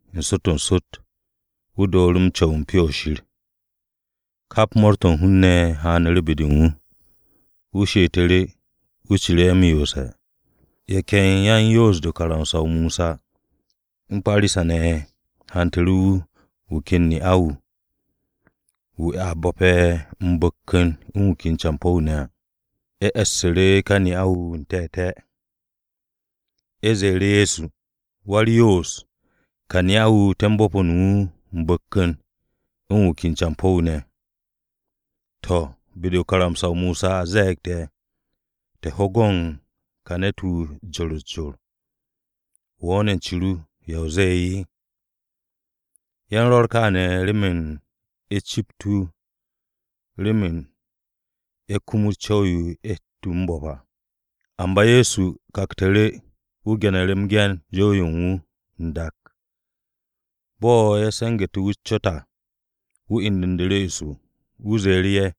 N-sot n-sot wu̱ dooru̱ m-co̱w u̱n Pyo-o̱ Shir. Kap mo̱o̱r-to̱ u̱n hun-ne̱ haanu̱ru̱ be-de u̱n wu̱. Wu̱ she'etu̱ru̱, wu̱ ciru̱ ye̱ m-yoose̱. Ye̱ ken yan-Yoos-de u̱n karamsa-o Mosa u̱n Parisa-ne̱ ne̱ ye̱ hantu̱ru̱ wu̱, wu̱ ken ne'a-wu̱, wu̱ a bo̱pe̱ m-bu̱kku̱n u̱n wu̱ ken campo̱-wu̱ ne̱ à. Ye̱ e̱ssu̱ru̱ ka ne'a-wu̱ n-te̱te̱. Ye̱ ze̱e̱ru̱ Ye̱so, “Wa-u̱r-Yoos, ka ne'a-wu̱, te̱ u̱n bo̱po̱n wu̱ m-bu̱kku̱n u̱n wu̱ ken campo̱-wu̱ ne̱. To̱, be-de u̱n karamsa-o Mosa a ze̱e̱g te̱, te̱ ho go̱n ka ne̱t-wu̱ u̱s-jor u̱s-jor. Wo̱ ne̱ u̱n ce ru, ¿ya o ze̱e̱?” Ye̱ u̱n rwo̱r kaane̱, remen ye̱ cept wu̱ remen ye̱ kumut o-co̱w yo ye̱ hette̱ wu̱ m-bo̱p à. Amba Ye̱so kaktu̱ru̱, wu̱ ge̱nu̱ru̱ m-ge̱n u̱n jow-yo u̱n wu̱ n-dak. Bo̱ ye̱ se̱ngu̱te̱ cot-se u̱n wu̱ à, wu̱ indu̱nu̱ru̱ eso. Wu̱ ze̱e̱ru̱ ye̱,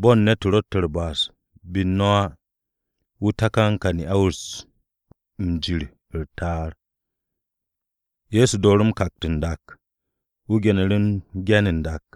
“Bo̱n ne̱t-wu̱ ro̱tte̱ u̱r-ba'as be u̱n no̱ á, wu̱ takan ka ne'a-wu̱ m-jir u̱r-ta'ar.” Ye̱so dooru̱ m-kakt n-dak. Wu̱ ge̱nu̱ru̱ m-ge̱n n-dak.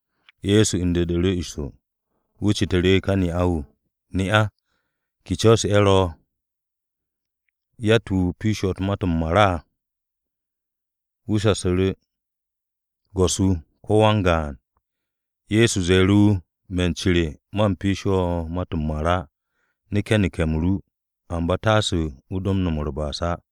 Ye̱so indu̱nu̱ru̱ eso. Wu̱ citu̱ru̱ ka ne'a-wu̱, “Ne'a, ¿ke co̱ ye̱ ro̱? ¿Yatt-wu̱ piishe̱ wo̱ ma-to̱ m-mar á?” Wu̱ shasu̱ru̱, “Go̱s-wu̱, ko̱ wan-gaan.” Ye̱so ze̱e̱ru̱ wu̱, “Me̱ u̱n ce re, man piishe̱ wo̱ ma-to̱ m-mar á. Neke̱ neke̱-m ru. Amba taase o do no̱m u̱r-ba'as á.”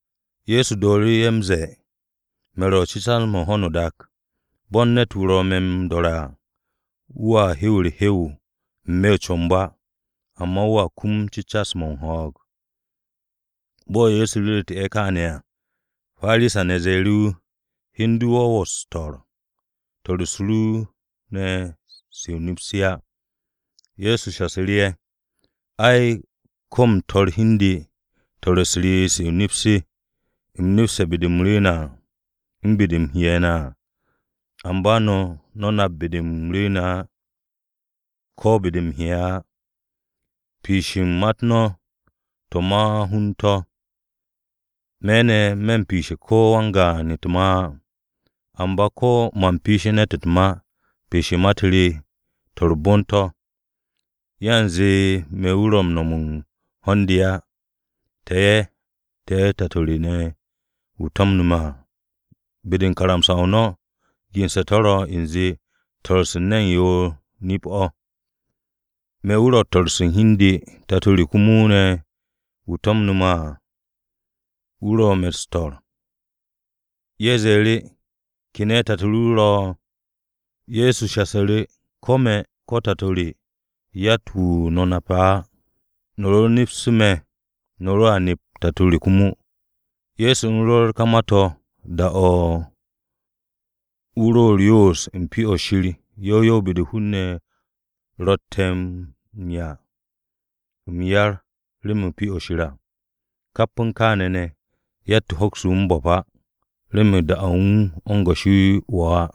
Ye̱so dooru̱ ye̱ m-ze̱e̱, “Me̱ wu̱ ro̱ cecas-mo̱ u̱n ho̱no o-dak. Bo̱n ne̱t-wu̱ ro̱ me̱ m-do̱re̱ à, wu̱a do m-hewe̱ u̱r-hew n-me̱ o-comb á, amba wu̱a kum cecas-mo̱ u̱n ho̱o̱g.” Bo̱ Ye̱so ru̱ru̱tu̱ ye̱ kááne̱ à, Parisa-ne̱ ze̱e̱ru̱ wu̱, “Hi u̱n du de̱ wo̱ m-su̱'e̱. Swo̱-u̱s ru ne̱ se o-nip se á.” Ye̱so shasu̱ru̱ ye̱, “Ai, ko̱ u̱m su̱'e̱ hi u̱n de, swo̱-u̱s re se o-nip se̱ u̱m nepste̱ be-de u̱m rwu̱u̱ne̱ à u̱n be-de u̱m he'e̱ ne̱ à. Amba no̱, no̱ nap be-de u̱m rwu̱u̱ne̱ á, ko̱ be-de u̱m he'e̱ á. Piish u̱n ma-u̱t no̱, to̱ ma-hun to̱. Me̱ ne̱, me̱ u̱n piishe̱ ko̱ wan-gaan u̱t-ma á. Amba ko̱ man piishe̱ ne̱t u̱t-ma, piish u̱n ma-u̱t re to̱ u̱r-bon to̱. Yanze me̱ wu̱ ro̱ m-no̱m u̱n ho̱n-de á. Te̱ ye̱, te̱ Tato re wu̱ to̱mne̱ me̱ à. Be-de u̱n karamsa-o no̱ gense̱ to̱ ro̱ u̱nze swo̱-se u̱n ne̱n yoor nip-o̱. Me̱ wu̱ ro̱ u̱n su̱'e̱ u̱n hi u̱n de. Tato re komo ne̱ wu̱ to̱mne̱ me̱ à, wu̱ ro̱ me̱ m-su̱'e̱.” Ye̱ ze̱e̱ru̱, “¿Ke ne̱ o̱ tato ru ro̱?” Ye̱so shasu̱ru̱, “Ko̱ me̱ ko̱ Tato re, yatt-wu̱ no̱ nape̱ á. No̱ ro nepse̱ me̱, no̱ roa nep Tato re komo.” Ye̱so u̱n rwo̱r ka ma-to̱ da-o̱ wu̱ ro u̱r-yoos u̱n Pyo-o̱ Shir yow yow u̱n be-de hun-ne̱ rotte̱ m-'ya m-yar remen Pyo-o̱ Shir à. Kap u̱n kááne̱ ne̱, yatt-wu̱ hokse̱ wu̱ m-bo̱p á, remen da-o̱ u̱n wu̱ o̱ u̱n goshi wo̱ á.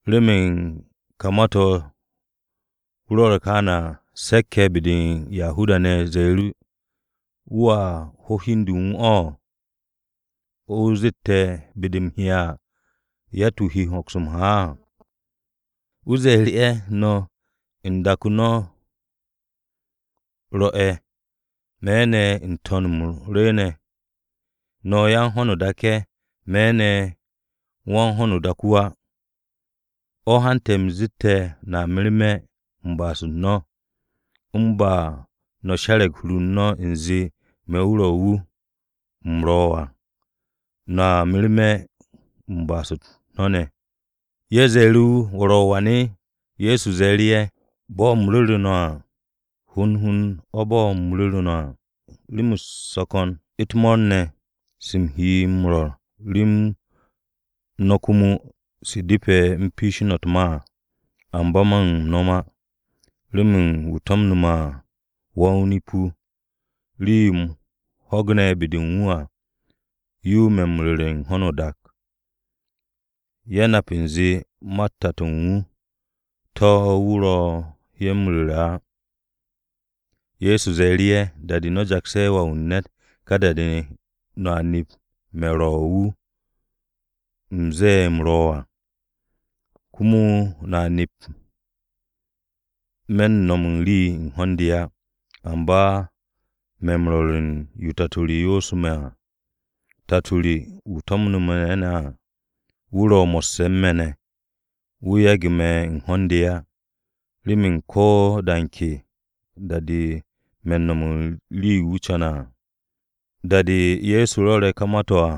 Remen ka ma-to̱ wu̱ rwo̱re̱ kááne̱ à, se̱k-ye̱ be-de u̱n Yahuda-ne̱ ze̱e̱ru̱, “¿Wu̱a ho̱ o̱ hi u̱n de u̱n wu̱? ¿O̱ wu̱ zette̱ ‘Be-de u̱m he'e̱ à, yatt-wu̱ de hoks m-ha á’?” Wu̱ ze̱e̱ru̱ ye̱, “No̱, u̱n dak-o̱ no̱ ro̱'e̱. Me̱ ne̱, n-To̱n o̱ u̱m rwu̱u̱ne̱. No̱ yan-ho̱no-o-dak ye̱, me̱ ne̱ wan-ho̱no-o-dak wu̱ á. O̱ hante̱ u̱m zet no̱a merme̱ u̱n ba'as-u̱t no̱ ne̱. U̱n ba de̱ no̱ she̱re̱g hur-u̱r no̱ u̱nze me̱ wu̱ ro̱, wu̱ u̱m ro̱ à, no̱a merme̱ u̱n ba'as-u̱t no̱ ne̱.” Ye̱ ze̱e̱ru̱ wu̱, “¿Wo̱ ro̱ wan?” Ye̱so ze̱e̱ru̱ ye̱, “Bo̱ u̱m ru̱ru̱ no̱ à, hond hond o̱ bo̱ u̱m ru̱ru̱ no̱ à. Rem-u̱s ro̱ ko̱n u̱t-mo̱o̱r ne̱, se u̱m he m-rwo̱r rem no̱ komo se depe̱ u̱m piishi no̱ u̱t-ma à. Amba man no̱m á. Remen wu̱ to̱mne̱ me̱ à, wa-o-nip-wu̱. Rii-yo u̱m ho̱gne̱ be-de u̱n wu̱ à, yo me̱ u̱n ru̱re̱ u̱n ho̱no o-dak.” Ye̱ nap u̱nze ma-u̱t Tato u̱n wu̱, to̱ wu̱ ro ye̱ m-ru̱re̱ á. Ye̱so ze̱e̱ru̱ ye̱, “Da-de no̱ jakse̱ Wà-wu̱ u̱n ne̱t, ka da-de ne̱, no̱a nep me̱ ro̱ wu̱ u̱m ze̱e̱ u̱m ro̱ à. Komo no̱a nep me̱n no̱m u̱n rii u̱n ho̱n-de à, amba me̱ m-rwo̱r u̱n yo Tato re yoosu̱ me̱ à. Tato re wu̱ to̱mne̱ me̱ ne̱ à, wu̱ ro̱ mo̱sse̱ u̱n me̱ ne̱. Wu̱ yage̱ me̱ u̱n ho̱n-de á, remen ko̱ de ke da-de me̱ u̱n no̱m u̱n rii-yo wu̱ co̱ne̱ à.” Da-de Ye̱so rwo̱re̱ ka ma-to̱ à,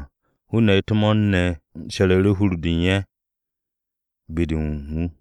hun-ne̱ u̱t-mo̱o̱r ne̱ ye̱ she̱ru̱ru̱ hur-de u̱n ye̱ be-de u̱n wu̱.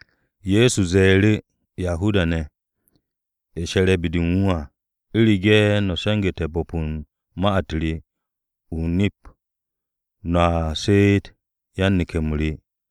Ye̱so ze̱e̱ru̱ Yahuda-ne̱ ye̱ she̱re̱ be-de u̱n wu̱ à, “U̱rege̱ no̱ se̱ngu̱te̱ bo̱p u̱n ma-u̱t re, o-nip, no̱a she'et yan-neke̱-m re.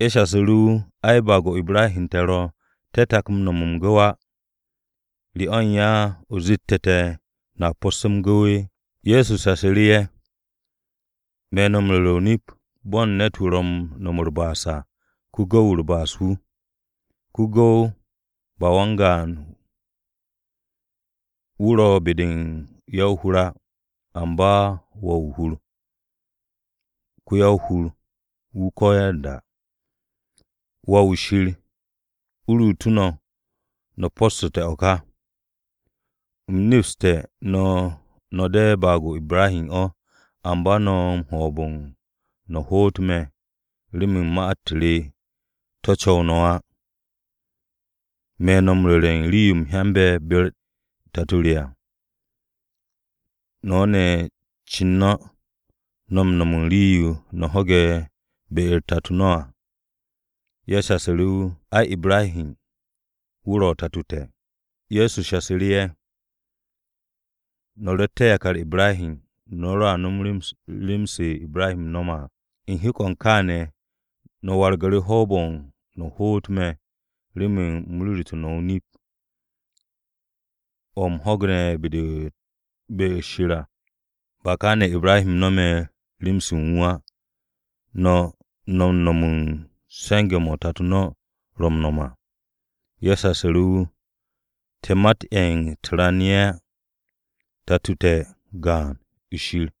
Ye̱ shasu̱ru̱ wu̱, “Ai, baag-o Ibrahi o̱ te̱ ro̱. Te̱ tak no̱me̱ u̱n ne̱t m-gu̱w á. ¿Re o̱ u̱n ya o zette̱ te̱, ‘No̱a po̱sse̱ m-gu̱w’?” Ye̱so shasu̱ru̱ ye̱, “Me̱ no̱ m-ru̱re̱ o-nip, bo̱ u̱n ne̱t-wu̱ ro̱ u̱n no̱m u̱r-ba'as à, ko-gu̱w-wu̱ u̱r-ba'as wu̱. Ko-gu̱w ba wan-gaan wu̱ ro̱ be-de u̱n ya-o-hur á, amba wà-wu̱ hur, ko-ya-o-hur-wu̱ ko̱yanda. Wà-wu̱ Shir, u̱ ruutu̱ no̱, no̱ po̱ssu̱te̱ o̱ ka. U̱m nepste̱ no̱ de̱ baag-o Ibrahi o̱, amba no̱ u̱n hoob-o̱ no̱ hoot me̱ remen ma-u̱t re, to̱ co̱w no̱ á. Me̱ ne̱ m-rwo̱r u̱n rii-yo u̱m hyande̱ be-u̱r Tato re à. No̱ ne̱ u̱n cin no̱, no̱ u̱n nom u̱n rii-yo no̱ ho̱ge̱ be-u̱r tato no̱ à.” Ye̱ shasu̱ru̱ wu̱, “Ai, Ibrahi wu̱ ro̱ tato te̱.” Ye̱so shasu̱ru̱ ye̱, “No̱ rotte̱ yakar Ibrahi, no̱ roa nom rem-se Ibrahi no̱me̱ à. U̱n hek-o̱ u̱n kááne̱, no̱ wargu̱ru̱ hoob-o̱ no̱ hoot me̱ remen u̱m ru̱ru̱tu̱ no̱ o-nip, o̱ u̱m ho̱gne̱ be-de Shir à. Ba kaane̱ Ibrahi no̱me̱ rem-se u̱n wu̱ á. No̱, no̱ u̱n no̱m u̱n se̱nge̱-mo̱ tato no̱ ro̱ m-no̱m à.” Ye̱ shasu̱ru̱ wu̱, “Te̱ mat-ye̱ u̱t-ran ye̱ á. Tato-o te̱ gaan-o̱, Shir.”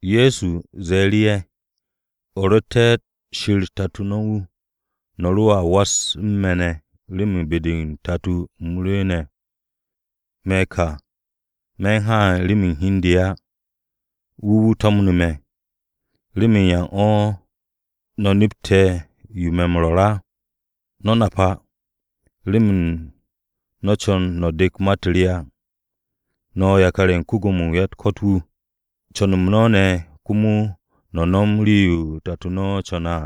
Ye̱so ze̱e̱ru̱ ye̱, “U̱ rotte̱ Shir tato no̱ wu̱, no̱ roa was u̱n me̱ ne̱ remen be-de o-Tato o̱ u̱m rwu̱u̱ne̱. Me̱ ka ne̱, me̱n haan remen hi u̱n de á. Wu̱ wu̱ to̱mne̱ me̱. ¿Remen yan o̱ no̱ nepte̱ yo me̱ m-rwo̱r á? No̱ nap á, remen no̱ co̱n no̱ dek ma-u̱t re á. No̱, tato no̱ ko-Gwo̱mo-wu̱ u̱n ya-u̱t-ko̱t wu̱. Co̱n-m no̱ ne̱ komo no̱ nom rii-yo tato no̱ co̱ne̱ à.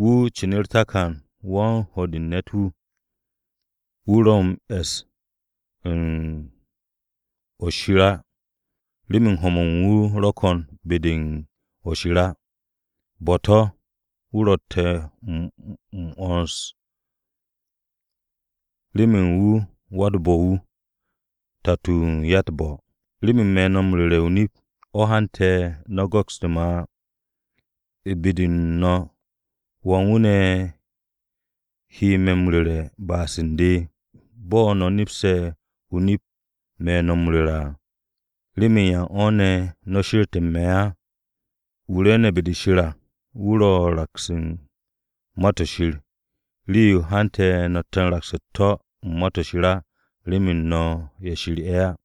Wu̱, cin u̱r-takan wan-ho̱ de u̱n ne̱t-wu̱. Wu̱ ro̱ m-e̱s u̱n o-nip á, remen ho̱-mo̱ u̱n wu̱ ro̱ ko̱n be-de u̱n o̱ shir á. Bo̱-to̱ wu̱ ro̱tte̱ m-'wo̱ns, remen wu̱ wa-u̱t-bo̱-wu̱, tato-o̱ u̱n ya-u̱t-bo̱. Remen me̱ no̱ m-ru̱re̱ o-nip, o̱ hante̱, no̱ go̱kste̱ á. U̱n be u̱n no̱ ¿wan wu̱ ne̱ he me̱ m-ru̱re̱ ba'as u̱n de? Bo̱ no̱ nepse̱ nip-o̱ me̱ no̱ m-ru̱re̱ à, ¿remen yan o̱ ne̱, no̱ she̱rte̱ u̱n me̱ á? Wu̱ rwu̱u̱ne̱ be-de Shir à wu̱ ro̱ m-raks u̱n Ma-to̱ Shir. Rii-yo hante̱ no̱tte̱ u̱n raks u̱t-to̱ u̱n Ma-to̱ Shir ne̱ á, remen no̱ ye̱ Shir ye̱ á.”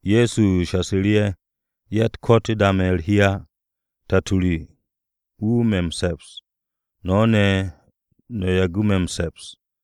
Ye̱so shasu̱ru̱ ye̱, “Ya-u̱t-ko̱t ye̱ da me̱ u̱r-hi á. Tato re wu̱ me̱ m-se̱ps. No̱ ne̱, no̱ yagu̱ me̱ m-se̱ps.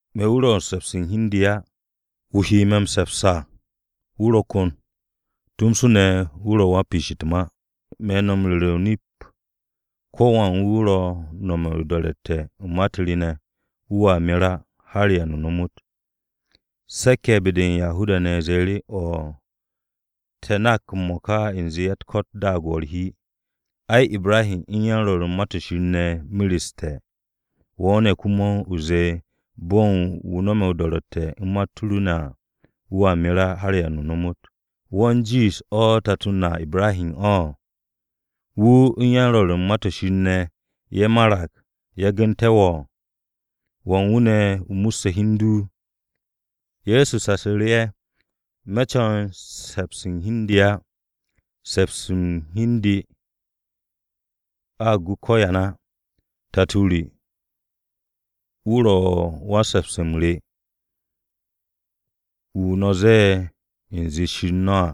Me̱ wu̱ ro̱ u̱n se̱pse̱ u̱n hi u̱n de á. Wu̱ he me̱ m-se̱ps à wu̱ ro̱ ko̱n. Wu̱ ro̱ tomso ne̱ wan-piish u̱t-ma. Me̱ no̱ m-ru̱re̱ o-nip, ko̱wan wu̱ ro̱ m-no̱m o-do̱ro̱tte̱ u̱n ma-u̱t re ne̱, wu̱a mer á har da-o̱ ba m-ta.” Se̱k-ye̱ be-de u̱n Yahuda-ne̱ ze̱e̱ru̱, “O̱'o̱, te̱ nak m-mo̱ka u̱nze ya-u̱t-ko̱t daag wo̱ u̱r-hi. Ai, Ibrahi u̱n yan-Rwo̱r u̱n Ma-to̱ Shir ne̱ mereste̱. Wo̱ ne̱ komo, o zee bo̱ u̱n wu̱ no̱me̱ o-do̱ro̱tte̱ u̱n ma-u̱t ru ne̱ à, wu̱a mer á har da-o̱ ba m-ta. ¿Wo̱ u̱n jiish tato na Ibrahi o̱? Wu̱ u̱n yan-Rwo̱r u̱n ma-to̱ Shir ne̱, ye̱ marag, yagu̱nte̱ wo̱. ¿Wan wu̱ ne̱ o musse̱ hi u̱n du?” Ye̱so shasu̱ru̱ ye̱, “Me̱ co̱n se̱ps u̱n hi u̱n de á. Se̱ps-mo̱ u̱n hi u̱n de, a gu ko̱yan á. Tato re, wu̱ ro̱ wan-se̱ps-m re, wu̱ no̱ m-ze̱e̱ u̱nze Shir no̱ à.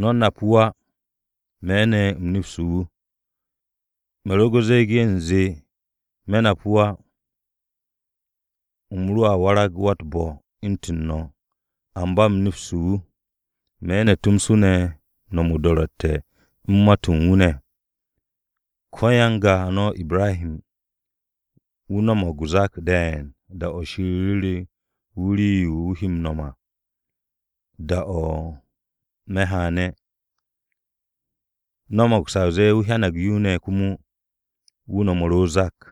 No̱ nap wu̱ á. Me̱ ne̱, u̱m nepse̱ wu̱. Me̱ ro ze̱e̱ge̱ u̱nze me̱ nap wu̱ á, u̱m roa warag wa-u̱t-bo̱ u̱ntu̱n no̱. Amba u̱m nepste̱ wu̱. Me̱ ne̱ tomso u̱n no̱m o-do̱ro̱tte̱ u̱n ma-to̱ u̱n wu̱ ne̱. Ko-ya-n-ga no̱ Ibrahi wu̱ no̱mo̱g o-zak de̱e̱n da-o̱ Shir ru̱re̱ wu̱ rii-yo u̱m he m-no̱m à da-o̱ me̱ haane̱. No̱mo̱g sa o zee wu̱ hyanag yo ne̱ komo, wu̱ no̱mu̱ru̱ o-zak.”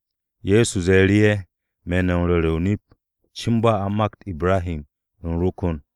Ye̱so ze̱e̱ru̱ ye̱, “Me̱ no̱ m-ru̱re̱ o-nip, cin ba a u̱n makt Ibrahi, ‘U̱m ro̱ ko̱n.’”